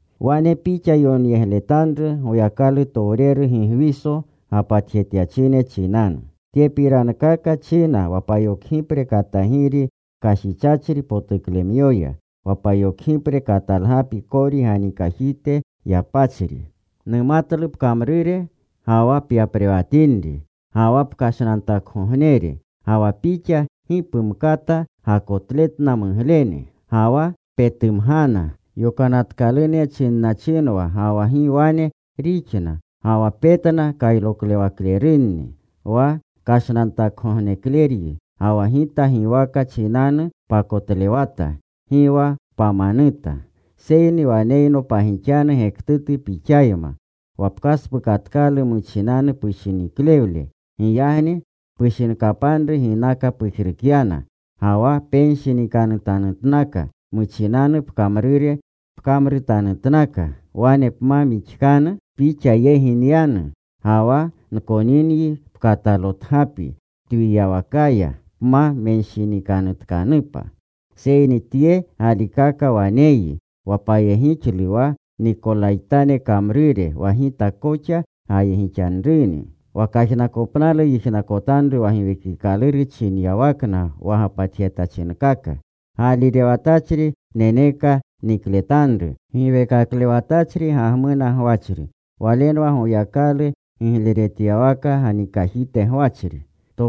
“Wane pixa yonyegletanru Goyakalutowreru Gigwiso gapatjetyachine chinanu: Tyepirankaka china wa payokgipre katagiri kashichachri potuklemyoya, wa payokgipre katalgapi kori ganikajite yapachri: Numatlu pkamrure ga wa pyaprewatinri ga wa pkashnantakgognere, ga wa pixa gi pumkata gakotletna muglene. Ga wa petumgana yokanatkalune chinnachinwa ga wa gi wane rixna. Ga wa petna kayroklewaklerunni. Wa kashnantakgognekleryi, ga wa Gita giwaka chinanu pakotlewata. Gi wa pamanuta. Seyni waneyno pagixanu gektutu pixayma. Wa pkaspukatkalu muchinanu pushiniklewle. Giyagni pushinkapanru ginaka pujrukyana. Ga wa penshinikanutanutka. Muchinanu pkamrure pkamruretanutka. Wane pma mixkanu, pixa yegi nyanu. Ga wa nkoninyi pkatalotgapi twiyawakaya, pma menshinikanutkanupa. Seyni tye galikaka waneyyi, wa payegixlu wa Nikolaytane kamrure wa Gita koxa gayegixanruni. Wa kajnakopnalu yijnakotanru wa Giwiwekikaluru chinyawakna wa gapatjetachinkaka. Gaalirewatachri neneka nikletanru giweekaklewatachri gagmuna gwachri. Walenwa Goyakalu gigletyawaka ganikajite gwachri.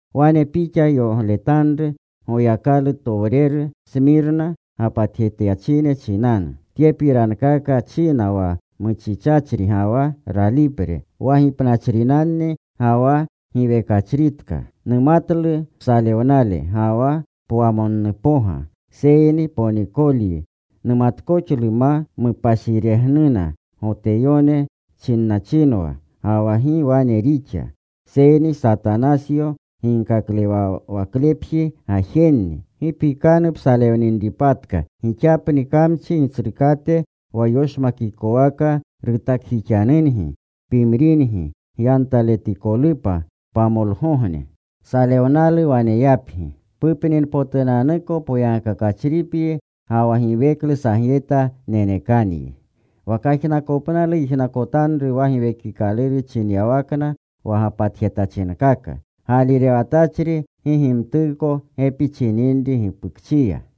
“Wane pixa yonyegletanru Goyakalutowreru Smirna gapatjetachine chinanu: Tyepirankaka china wa muchichachri ga wa ralipre, wa gipnachrinanni ga wa giwekachritka. Numatlu psalewnale ga wa pwamonnupoga, seyni ponikolyi. Numatkoxlu ma mupashiregnunna Goteyone chinachinwa ga wa gi wane rixa. Seyni Satanasyo ginkaklewawaklepji gajenni. Gi pikanu psalewninripatka. Gixapni kamchi gitsrukate wa yoshmakikowaka rutakjixanungi pimringi, gyantaletikolupa. Pamolgogne salewnalu waneyapgi. Pupninpotunanuko poyagkakachripyi ga wa giweklu sagyeta nenekanyi. Wa kajnakopnalu yijnakotanru wa Giwekikaluru chinyawakna wa gapatjetachinkaka. Gaalirewatachri gi gimtuko gepi chininri gipukchiya.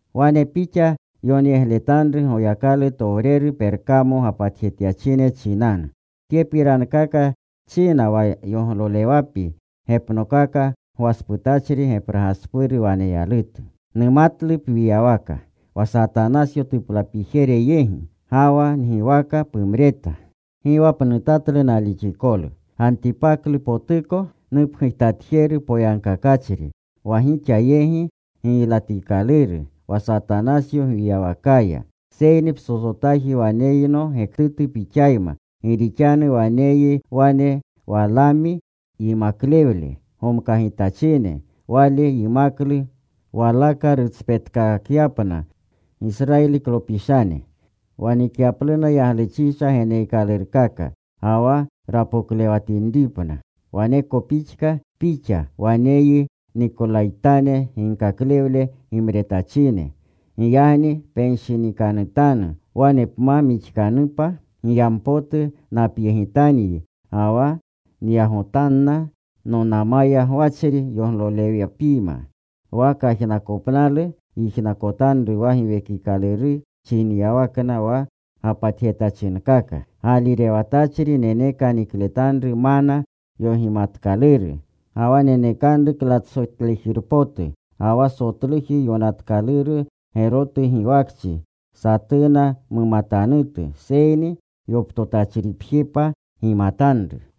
“Wane pixa yonyegletanru Goyakalutowreru Perkamo gapatjetyachine chinanu: Tyepirankaka china wa yoglolewapi gepnokaka gwasputachri gepraspuru waneyalutu. Numatlu pwiywaka, wa Satanasyo tuplapijere yegi. Ga wa ngiwaka pumreta. Gi wa pnutatlu nalixikolu, Gantipaklupotuko, nupgujtatjeru poyagkakachri, wa gixa yegi giylatikaluru, wa Satanasyo gwiyawakaya. Seyni psotsotaji waneyno gektutu pixayma. Gi rixanu waneyyi wane Walaami yimaklewle gomkagitachine. Wale yimaklu Walaka rutspetkakyapna Gisrayiliklopishane, wa nikyapluna yagluchisha geneekalurkaka, ga wa rapoklewatinripna. Waneko pixka pixa. Waneyyi Nikolaytane ginkaklewle gimretachine. Giyagni penshinikanutanu. Wane pma mixkanupa, giyanpotu napyegitanyi, ga wa nyagotanna nonama gwachri yoglolewapiyma. Wa kajnakopnalu yijnakotanru wa Giwekikaluru chinyawakna wa gapatjetachinkaka. Gaalirewatachri neneka nikletanru mana yogimatkaluru. Ga wa nenekanru klatsotlejirpotu, ga wa sotluji yonatkaluru gerotu giwakchi satuna mumatanutu. Seyni yoptotachripjepa gimatanru.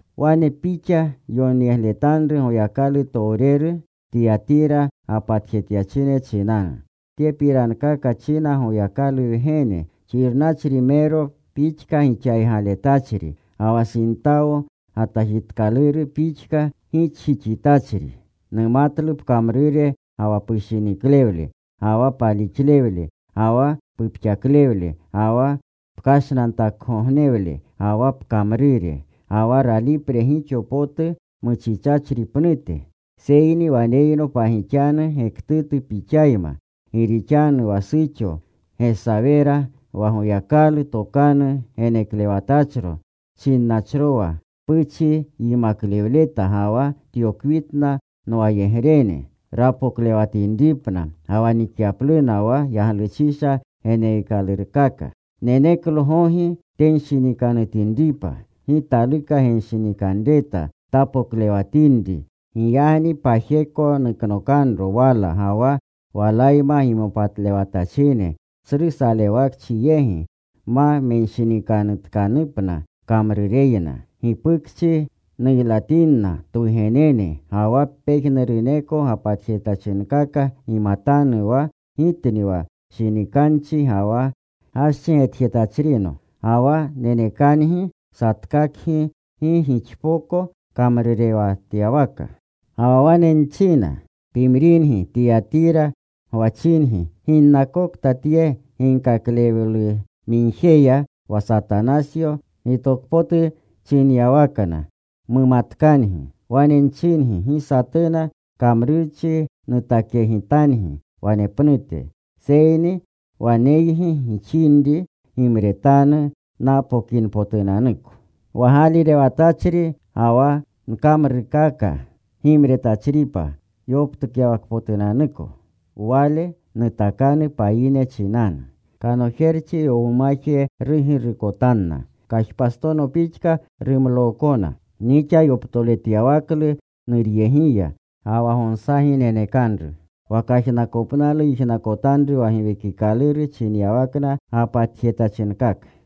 “Wane pixa yonyegletanru Goyakalutowreru Tiyatira gapatjetyachine chinanu: Tyepirankaka china Goyakalu Wgene, xirnachrimero pixka gixaygaletachri, ga wa sintawo gatajitkaluru pixka gixjixitachri. Numatlu pkamrure ga wa pushiniklewle, ga wa palixlewle, ga wa pupxaklewle, ga wa pkashnantakgognewle, ga wa pkamrure, ga wa ralipre gixo potu muchichachri pnute. Seyni waneyno pagixanu gektutu pixayma. Gi rixanu wa suxo Gesawera wa Goyakalu tokanu geneklewtachro chinnachrowa puchi yimaklewleta ga wa tyokwitna nwayegrene, rapoklewatinripna ga wa nikyapluna wa yagluchisha geneekalurkaka. Neneklo gogi tenshinikanutinripa. Gi taluka genshinikanreta tapoklewatinri. Giyagni pajeko nuknokanro wala ga wa walayma gimopatlewatachine, tsru salewakchi yegi, ma menshinikanutkanupna kamrureyna. Gipukchi nuylatinna twugenene. Ga wa pejnuruneko gapatjetachinkaka gimatanu wa Gitni wa shinikanchi ga wa gaschi getjetachrino. Ga wa nenekangi satkakgi gi gixpoko kamrurewatyawaka. Ga wa wane nchina, pimringi Tiyatira gwachingi ginnakokta tye ginkaklewlumigjeya, wa Satanasyo gitokpotu chinyawakna, mumatkangi. Wane nchingi, gi satuna kamrurchi nutakyegitangi wanepnute. Seyni wa waneygi gixinri gimretanru napokinpotunanuko. Wa gaalirewatachri ga wa nkamrurkaka gimretachripa yoptukyawakpotunanuko, wale nutakanu payine chinanu. Kanojerchi yowumaje rugirukotanna. Kajpastono pixka rumlookona, nixa yoptoretyawaklu Nuryegiya. Ga wa gonsagi nenekanru. Wa kajnakopnalu yijnakotanru wa Giwekikaluru chinyawakna gapatjetachinkaka.